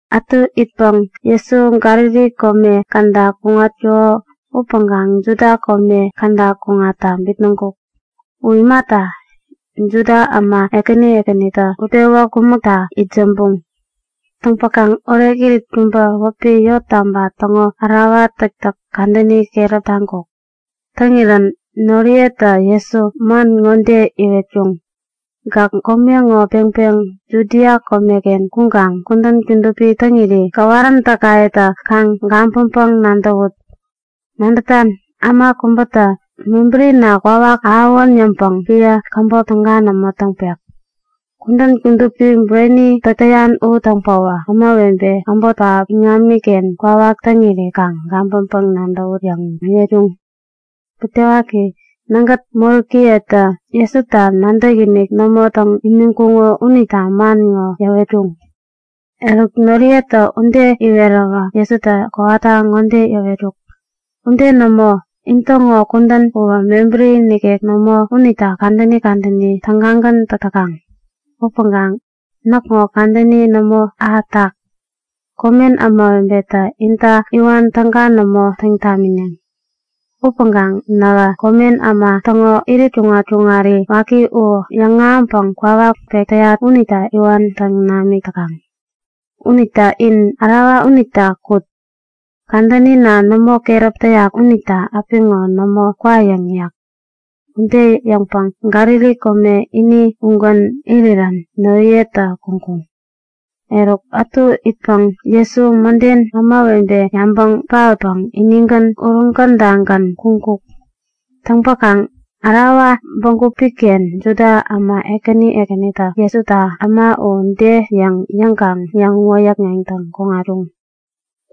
Ätu itpäŋ Jesu Galili kome käda kuŋatkuko upäŋkaŋ Judia kome käda kuŋatta bitnäŋkuk. U imata, Juda äma ekänitä utpewä kumäkta itsämbuŋ. Täŋpäkaŋ orekirit kubä wäpi Yottaba täŋo Ärawa Täktäk kadäni keräp taŋkuk. Täŋirän noriyetä Jesu man ŋode iwetkuŋ; Gäk kome ŋo peŋpeŋ Judia komeken kuŋkaŋ kudän kudupi täŋiri gäwaräntäkayetä kaŋ gabäŋpäŋ-nadäwut. Nadätan, äma kubätä mebärina kwawak ahäwän yäŋpäŋ epän käbop täga nämo täŋpek. Kudän kudupi bureni täk täyan u täŋpäwä ämawebe äbot pähap iŋamiken kwawak täŋiri kaŋ gabäŋpäŋ-nadäwut yäŋ iwetkuŋ. (Butewaki, nägät moräkiyetä Jesuta nadäkinik nämo täŋ imiŋkuŋo unita man ŋo iwetkuŋ.) Noriyetä ude iweräwä Jesutä kowata ŋode yäwetkuk; Ude nämo! In täŋo kudän uwä mebäri nikek nämo unita kadäni kadäni tägagän täk täkaŋ. Upäŋkaŋ näkŋo kadäni nämo ahätak. Komen ämawebetä inta iwan täga nämo täŋ tamineŋ. Upäŋkaŋ nähä komen äma täŋo irit kuŋat-kuŋari waki u yäŋahäŋpäŋ kwawak pek täyat unita iwan täŋ namik täkaŋ. Unita in ärawa unita kut. Kadänina nämo keräp täyak unita apiŋo nämo kwayäŋ yäk. Ude yäŋpäŋ Galili kome ini ugän irirän noriyetä kuŋkuŋ. Eruk ätu itpäŋ Jesu mäden ämawebe yabaŋ paotpäŋ inigän uruŋ kadagän kuŋkuk. Täŋpäkaŋ ärawa bägup-ken Juda äma ekäni ekänitä Jesuta Äma u de yäŋ yäŋkaŋ yäŋ-wäyäkŋeŋtäŋ kuŋatkuŋ.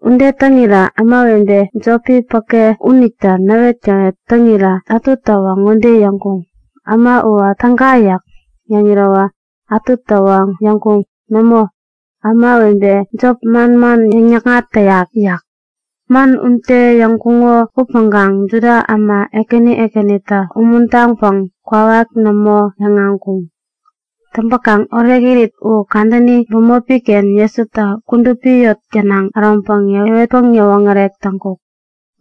Ude täŋirä ämawebe jopi päke unitä näwetgäwet täŋirä ätutäwä ŋode yäŋkuŋ; Äma uwä täga yäk. Yäŋirä ätutäwä yäŋkuŋ; Nämo, ämawebe jop manman yäŋ-yäkŋat täyak yäk. Man ude yäŋkuŋo upäŋkaŋ Juda äma ekäni ekänita umuntaŋpäŋ kwawak nämo yäŋahäŋkuŋ. Täŋpäkaŋ orekirit u kadäni bämopi-ken Jesutä kudupi eŋi gänaŋ äroŋpäŋ yäwetpäŋ yäwoŋärek täŋkuk.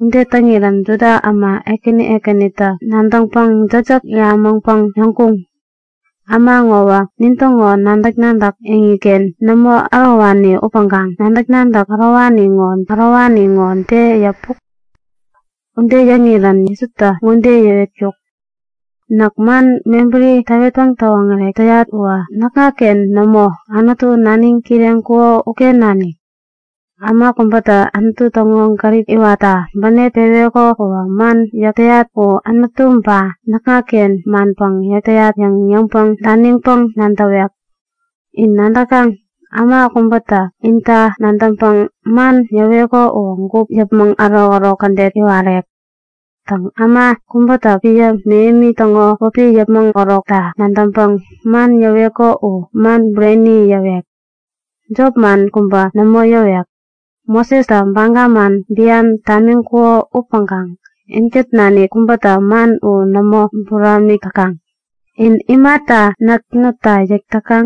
Ude täŋirän Juda äma ekäni ekänitä nadäŋpäŋ jäkjäk yämäŋpäŋ yäŋkuŋ; Äma ŋowä nintäŋo nadäk-nadäk eŋiken nämo ärowani upäŋkaŋ nadäk-nadäk ärowani ŋo de yäpuk? Ude yäŋirä Jesutä ŋode yäwetkuk; Näk man mebäri täwetpäŋ täwoŋärek täyat uwä näkŋaken nämo. Anutu, naniŋ kireŋkuko uken nanik. Äma kubätä Anutu täŋo gärip iwatta bänep peweko uwä man yäk täyat u Anutu ba näkŋaken manpäŋ yäk täyat yäŋ yäpmäŋ daniŋpäŋ nadäwek. In nadäkaŋ? Äma kubätä inita nadäŋpäŋ man yäweko uwä gup yäpmäŋ ärokärok kädet iwarek. Täŋ, äma kubätä epän mähemi täŋo wäpi yäpmäŋ akukta nadäŋpäŋ man yäweko uwä man bureni yäwek. U jopman kubä nämo yäwek. Mosestä baga man bian tamiŋkuko upäŋkaŋ inkät nanik kubätä man u nämo buramik täkaŋ. In imata näk nutta yäk täkaŋ?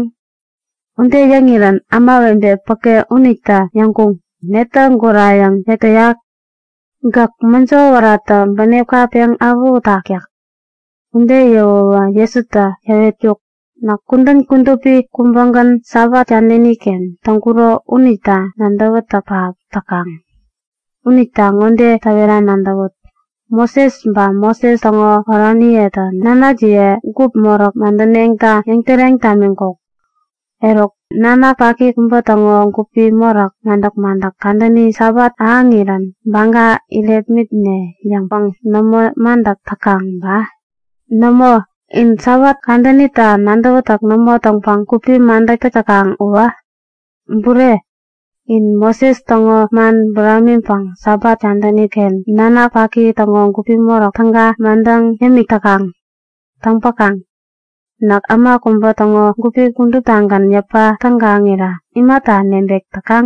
Ude yäŋirän ämawebe päke unitä yäŋkuŋ; Netä gurayäŋ yäk täyak? Gäk mäjo wäratä bänepka peŋ awähutak yäk. Ude yäwäwä Jesutä yäwetkuk; Näk kudän kudupi kubägän Sabat kadäni-ken täŋkuro unita nadäwätäk pähap täkaŋ. Unita ŋode täwera nadäwut; Moses ba Moses täŋo oraniyetä nanakjiye gupi moräk madäneŋta yäŋtäreŋ tamiŋkuk. Eruk nanak paki kubä täŋo gupi moräki madäk-madäk kadäni Sabat ahäŋirän baga irepmitne yäŋpäŋ nämo madäk täkaŋ ba? Nämo! In Sabat kadänita nadäwätäk nämo täŋpäŋ gupi madäk täk täkaŋ uwä! Bureni, in Moses täŋo man buramiŋpäŋ Sabat kadäni-ken nanak paki täŋo gupi moräk täga madäŋ yämik täkaŋ. Täŋpäkaŋ näk äma kubä täŋo gupi kuduptagän yäpa tägaŋirä imata nebek täkaŋ?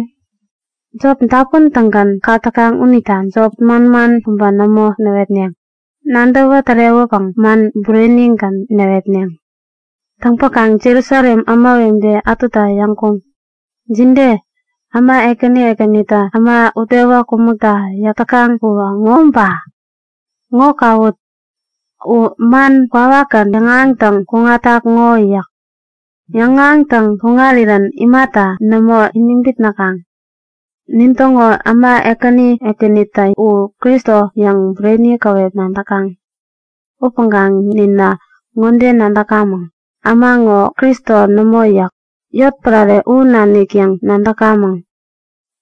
Jop dapun-tägän kak täkaŋ unita jop manman kubä nämo näwetneŋ. Nadäwä tärewäpäŋ man burenigän näwetneŋ. Täŋpäkaŋ Jerusalem ämawebe ätutä yäŋkuŋ; Jide? Äma ekäni ekänitä äma utpewä kumäkta yäk täkaŋ uwä ŋo ba? Ŋo kawut! U man kwawakgän yäŋahäŋtäŋ kuŋatak ŋo yäk. Yäŋahäŋtäŋ kuŋarirän imata nämo iniŋ bitnäkaŋ? Nintäŋo äma ekäni ekänitä U Kristo yäŋ bureni käwep nadäkaŋ. Upäŋkaŋ ninä ŋode nadäkamäŋ, äma ŋo Kristo nämo yäk. Yotpärare u nanik yäŋ nadäkamäŋ.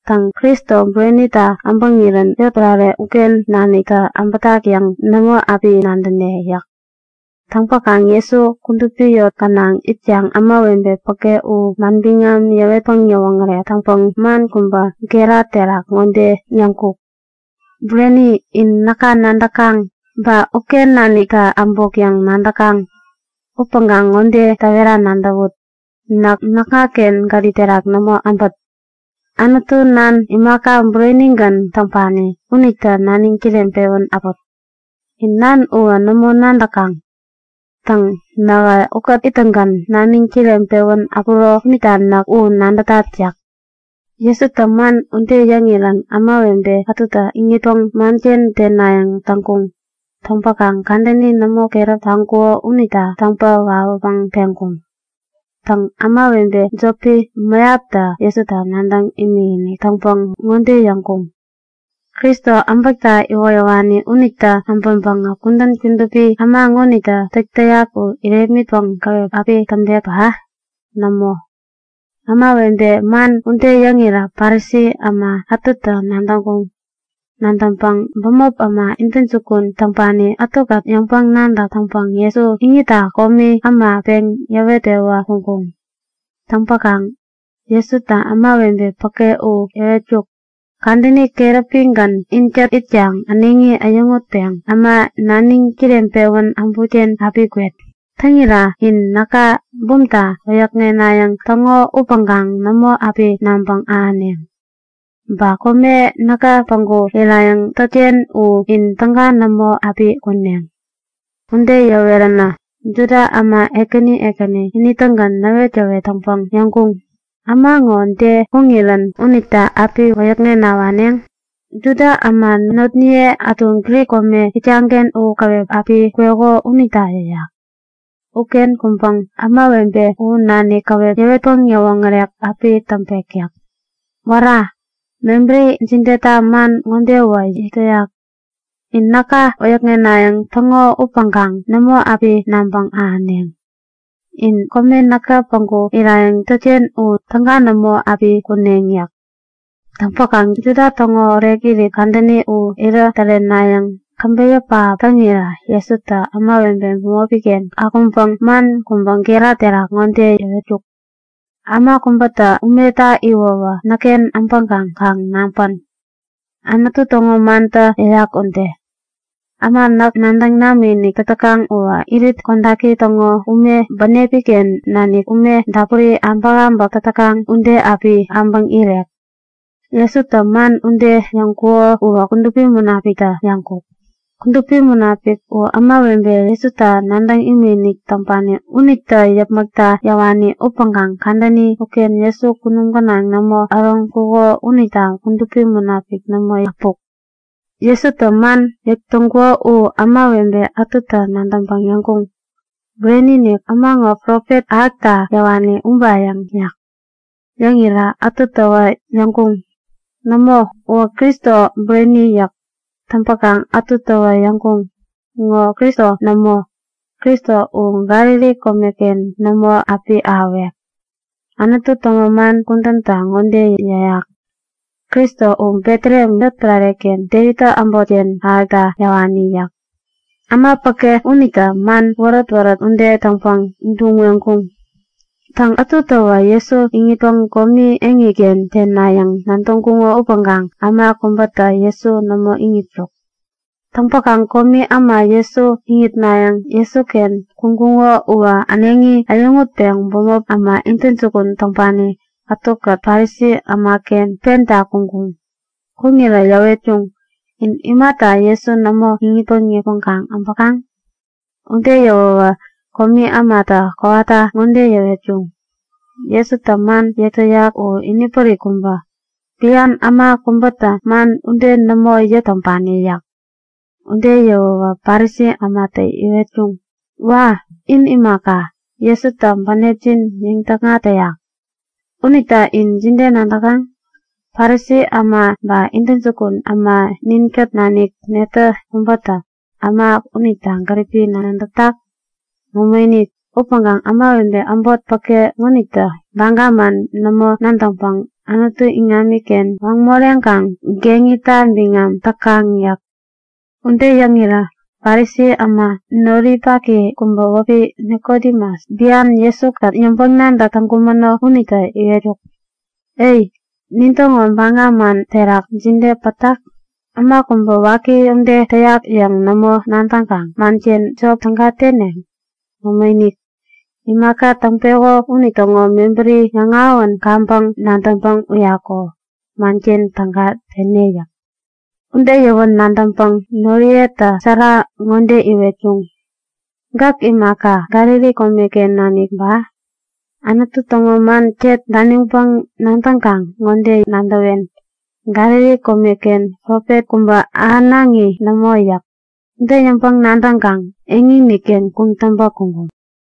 Täŋ, Kristo burenitä äbäŋirän yotpärare uken naniktä äbätak yäŋ nämo api nadäne yäk. Täŋpäkaŋ Jesu kudupi eŋi gänaŋ itkaŋ ämawebe päke u manbiŋam yäwetpäŋ yäwoŋärek täŋpäŋ man kubä gera terak ŋode yäŋkuk; Bureni, in näka nadäkaŋ. Ba uken naniktä äbuk yäŋ nadäkaŋ. Upäŋkaŋ ŋode täwera nadäwut; Näk näkŋaken gärip terak nämo äbät. Anutu Nan, imaka burenigän täŋpani, unitä naniŋ kireŋpewän äput. In Nan uwä nämo nadäkaŋ. Täŋ, nähä ukät ittäŋgän naniŋ kireŋpewän äpuro unita näk u nadätat yäk. Jesutä man ude yäŋirän ämawebe ätutä iŋitpäŋ manken tenayäŋ täŋkuŋ. Täŋpäkaŋ kadänini nämo keräp taŋkuko unita täŋpä wawäpäŋ peŋkuŋ. Täŋ, ämawebe jopi mäyaptä Jesuta nadäŋ imikinik täŋpäŋ ŋode yäŋkuŋ; Kristo äbäkta iwoyäwani unitä äbäŋpäŋä kudän kudupi äma ŋonitä täk täyak u irepmitpäŋ täga api täŋpek ba? Nämo! Ämawebetä man ude yäŋirä Parisi äma ätutä nadäŋkuŋ. Nadäŋpäŋ bämop äma intäjukun täŋpani ätukät yäŋpäŋ-nadäk täŋpäŋ Jesu iŋitta komi äma peŋ yäwet-pewä kuŋkuŋ. Täŋpäkaŋ Jesutä ämawebe päke u yäwetkuk; Kadäni keräpigän inkät itkaŋ äneŋi äyäŋutpeŋ äma naniŋ kireŋpewän äbutken api kwet. Täŋira in näka bumta wäyäkŋenayäŋ täŋo upäŋkaŋ nämo api nabäŋ ahäneŋ. Ba kome näkä päŋku irayäŋ tätken u in täga nämo api kuneŋ. Ude yäweränä, Juda äma ekäni ekäni ini-tägän näwetgäwet täŋpäŋ yäŋkuŋ; Äma ŋo de kuŋirän unita api wäyäkŋena waneŋ? Juda äma notniye ätu Grik kome itkaŋ-ken u käwep api kweko unita yäyak. Uken kuŋpäŋ ämawebe u nanik käwep yäwetpäŋ yäwoŋärek api täŋpek yäk. Wära! Mebäri jideta man ŋodewä yäk täyak; In näka wäyäkŋenayäŋ täŋo upäŋkaŋ nämo api nabäŋ ahäneŋ. In kome näkä päŋku irayäŋ tätken u täga nämo api kuneŋ yäk. Täŋpäkaŋ Juda täŋo orekirit kadäni u irä tärenayäŋ käbeyä pähap täŋirä Jesutä ämawebe bämopi-ken akuŋpäŋ man kubä gera terak ŋode yäwetkuk; Äma kubätä umeta iwäwä näkken äbäŋkaŋ kaŋ naŋpän! Anutu täŋo mantä yäyak ude; Äma näk nadäŋ namikinik täk täkaŋ uwä irit kodaki täŋo ume bänepi-ken nanik ume dapuri abäkabäk täk täkaŋ ude api äbäŋ irek. Jesutä man ude yäŋkuko uwä Kudupi Munapikta yäŋkuk. Kudupi Munapik u ämawebe Jesuta nadäŋ imikinik täŋpani unitä yäpmäkta yäwani upäŋkaŋ kadäni uken Jesu kunum gänaŋ nämo äroŋkuko unita Kudupi Munapik nämo äpuk. Jesutä man yäk täŋkuko u ämawebe ätutä nadäŋpäŋ yäŋkuŋ; Bureni-inik, äma ŋo Profet ahäkta yäwani ubayäŋ yäk. Yäŋirä ätutäwä yäŋkuŋ; Nämo, uwä Kristo bureni yäk. Täŋpäkaŋ ätutäwä yäŋkuŋ; Ŋo Kristo nämo. Kristo u Galili komeken nämo api ahäwek. Anutu täŋo man kudäntä ŋode yäyak; Kristo u Betlehem yotpärare-ken Devittä äbotken ahäkta yäwani yäk. Äma päke unitä man wärät-wärät ude täŋpäŋ duŋ-weŋkuŋ. Täŋ, ätutäwä Jesu iŋitpäŋ komi eŋiken tenayäŋ nadäŋkuŋo upäŋkaŋ äma kubätä Jesu nämo iŋitkuk. Täŋpäkaŋ komi äma Jesu iŋitnayäŋ Jesuken kuŋkuŋo uwä äneŋi äyäŋutpeŋ bämop äma intäjukun täŋpani ätukät Parisi ämaken penta kuŋkuŋ. Kuŋirä yäwetkuŋ; In imata Jesu nämo iŋitpäŋ yäpmäŋ äbäkaŋ? Ude yäwäwä komi ämatä kowata ŋode yäwetkuŋ; Jesutä man yäk täyak u inipärik kubä. Bian äma kubätä man ude nämo yäk täŋpani yäk. Ude yäwäwä Parisi ämatä yäwetkuŋ; Wa! In imaka, Jesutä bänepjin yäŋ-täkŋat täyak? Unita in jide nadäkaŋ? Parisi äma ba intäjukun äma ninkät nanik netä kubätä äma unita gäripi nadätak? Nämoinik! Upäŋkaŋ ämawebe äbot päke ŋonitä baga man nämo nadäŋpäŋ Anutu iŋamiken waŋ moreŋkaŋ geŋita biŋam täkaŋ yäk. Ude yäŋirä Parisi äma noripaki kubä wäpi Nikodemus, bian Jesu-kät yäŋpäŋ-nadäk täŋkumäno unitä yäwetkuk; E, nintäŋo baga man terak jide pätak? Äma kubä waki ude täyak yäŋ nämo nadäŋkaŋ manken jop täga tene? Nämoinik! Imaka täŋpeko unitäŋo mebärini yäŋahäwän kaŋpäŋ nadäŋpäŋ uyaku manken täga tene yäk. Ude yäwän nadäŋpäŋ noriyetä sära ŋode iwetkuŋ; Gäk imaka, Galili komeken nanik ba? Anutu täŋo man ket daniŋpäŋ nadäŋkaŋ ŋode nadäwen; Galili komeken profet kubä ahänaŋi nämo yäk. Ude yäŋpäŋ-nadäŋkaŋ eŋini-ken kuŋtäŋpä kuŋkuŋ.